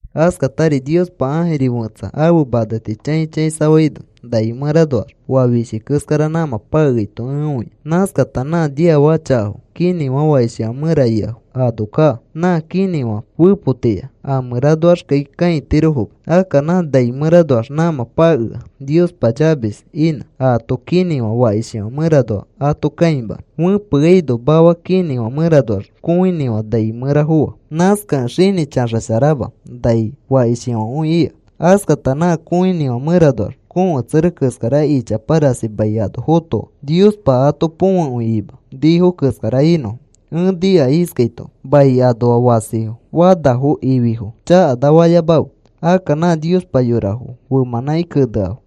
Askatari Niospa ãjiri fẽtsa ãfe maneti chãi chãisafaino nai mẽranoax oa fishi keskara nãmã pakeaito ẽ õia. Nãskata nã niafaka chakafo kinĩfã fakishifã mẽra ikafo ano kaa. Nã kinĩfã fepotiya. A mẽranoaxkai kãitirofoma. Akka nã nai mẽranoax nãmã pakea Niospa chavis inã aato kinĩfã fakishifã mẽranoa ato kãimanõ. Fẽpeaino mafa kinĩfã mẽranoax kõinĩfã nai mẽra foa. Nãskakẽ xinĩ chaxasharama. Nai fakishkõi ika. Askata nã kõinĩfã mẽranoax kõketsere keskara ichapa rasi mai ano fotoa. Niospa ato põfekõi ima nifo keskara inõfo. Ẽ nika iskaito: “Mai anoa fasifo fanafo ififo chakana fayamakãfe. Akka nã Niospa yorafo femãnãki keneafo,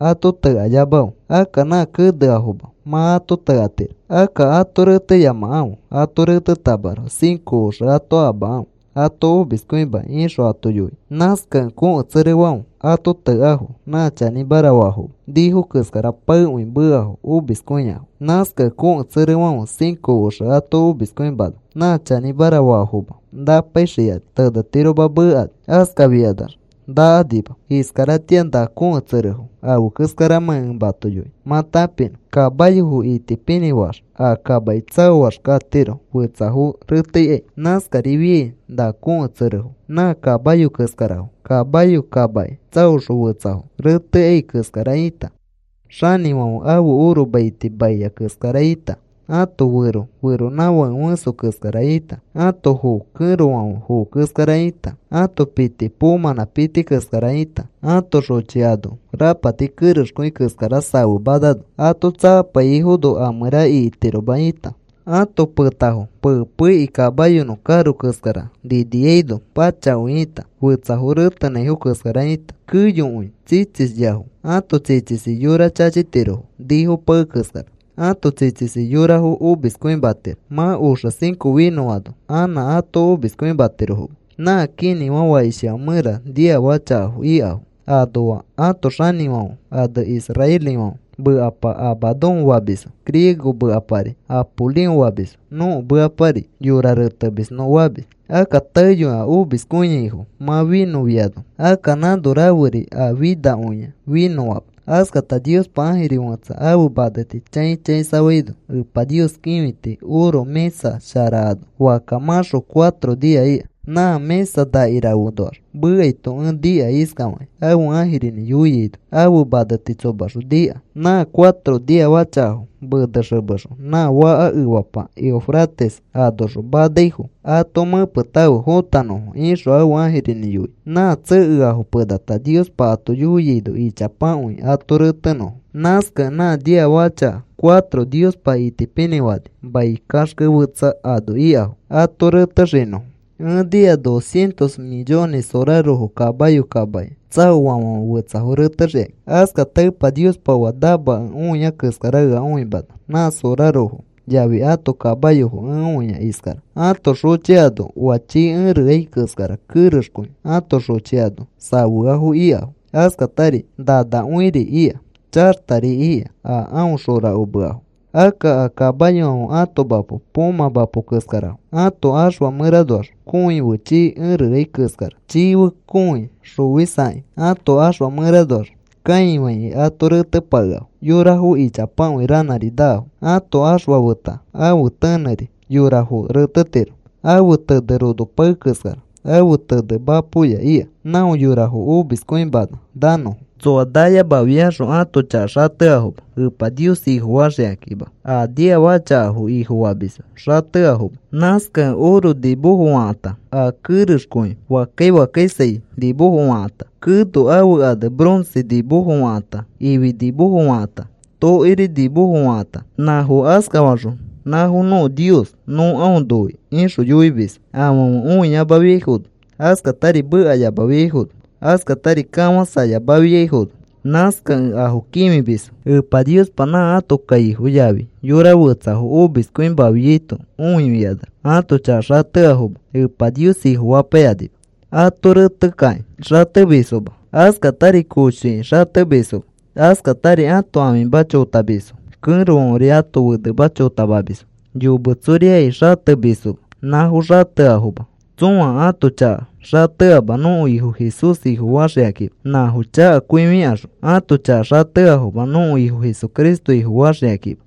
ato tekayamakãfe. Akka nã keneamafo mã ato tekatiro. Akka ato reteyamakãfe. Ato retetamaroko cinco oxe ato amakãfe ato omiskõimakĩ,” ixõ ato yoia. Nãskakẽ kõketserefãfe ato tekafo nã chanĩmara faafoma nifo keskara paekõi meafo omiskõiafo. Nãskakẽ kõketserefãfe cinco oxe ato omiskõimana nã chanĩmara faafomafo napaixikani, tenetirofoma mekani. Askafikanax nakanima. Iskaratĩa na kõketserefo afe keskaramãkĩ ẽ mato yoinõ mã tãpinõ. Kamayofo itipinĩ faax a kamaki tsaoax katiro fetsafo reteikai. Nãskarifiai na kõketserefo nã kamayo keskarafo. Kamayo kamaki tsaoxõ fetsafo reteikai keskara ĩta, xanĩfãfe ãfe oro maiti maia keskara ĩta, ãto fẽso feronãfãke fẽso keskara ĩta, ãto foo kẽrofãfe foo keskara ĩta, ãto piti poomãnã piti keskara ĩta, ãto xochi ano rapati kerexkõi keskara safemanano ato tsakapaiyaifono a mẽra ikitiroma ĩta, ãto petafo pei pei ikĩ kamayonõ karo keskara niniaino pachakõi ĩta, fetsafo retenãifo keskara ĩta, keyokõi tsitsisyafo. Ãto tsitsisi yora chachitiro nifo pae keskara. Ãto tsitsisi yorafo omiskõimatiro. Mã oxe cinco finõano anã ato omiskõimatirofoma. Nã kinĩfã fakishifã mẽra niafaka chakafo ikafo anoa ãto xanĩfãfe ane israelifãfe mekapa Abadón famisfo. Griego mekapari Apolión famisfo. Nõko mekapari, “Yorafo Retemis,” nõ famis. Akka taeyoi a omiskõiaifo mã finõfiano, akka nãno raferi a finakõia finõama. Askata Niospa ãjiri fẽtsa ãfe maneti chãi chãisafaino, Epa Nios kĩfiti oro mĩsa shara ano fakka mãxo cuatro nia ika. Nã mĩsa nakirafenoax mekaito ẽ nika iskafakĩ ãfe ãjirinĩ yoiaino ãfe maneti tsomaxõ nika. “Nã cuatro niafaka chakafo menexemexõ nã faka efapa Eufrates anoxõ manaifo ato mẽpetãfe fotanõfo,” ixõ ãfe ãjirinĩ yoia. Nã tsekeafo penata Niospa ato yoiaino ichapakõi ato retenõfo. Nãskakẽ nã niafaka chaka cuatro Niospa itipinĩfani mai kaxke fetsa ano ikafo ato retexinõfo. Ẽ nika dos cientos millones sorarofo kamayo kamaki tsaoafãfe fetsafo retexikakĩ. Askata Epa Niospa oa namakẽ õia keskara ea õimana nã sorarofo yafi ãto kamayofo ẽ õia iskara. Ãto xochi ano oa chii ereai keskara kerexkõi ãto xochi ano safeafo ikafo. Askatari nanakõiri ika, chaxtari ika a aõ xorakomeafo. Akka a kamayofãfe ãto mapo poomã mapo keskarafo. Ãto ãxfa mẽranoax kõi fe chii ereai keskara. Chii fe kõi xofisakĩ ãto ãxfa mẽranoax kãifaikĩ ato retepakeafo yorafo ichapakõi ranãri naafo. Ãfe ãxfa feta ãfe tenẽri yorafo retetiro. Ãfe tene rono pae keskara. Ãfe tene mapoya ika. Não yorafo omiskõimana nanõfo. Tsoa nayamafiaxõ ãto chaka xateafoma Epa Nios Ifofaxikakĩma. A niafaka chakafo ifofamisfo xateafoma. Nãskakẽ oro nimofo fakãta, a kerexkõi fakkai fakkaisai nimofo fakãta, keno ãfe ane bronce nimofo fakãta, ifi nimofo fakãta, tokiri nimofo fakãta; nãfo askafaxõ, “Nãfo nõko nios. Nõ aõ noi,” ixõ yoimisfo. Afãfe õiyamafiaifono, askatari mekayamafiaifono, askatari kafãsayamafiaifono, nãskakẽ afo kĩfimisfo. Epa Niospa nã ãto kaifo yafi yora fetsafo omiskõimafiaito õifikanax ãto chaka xateafoma Epa Nios Ifofapaikanima. Ato retekakĩ xatemisfoma, askatari koshoiki xatemisfoma, askatari ãto ãfima chotamisfo, kẽrofãferi ãto fenema chotamamisfo, yometsoriai xatemisfoma nãfo xateafoma. Tsõa ãto chaka xateama. Nõko Ifo Jesús Ifofaxikakima. Nãfo chakakõifikaxõ ãto chaka xateafoma nõko Ifo Jesucristo Ifofasharaxikakima.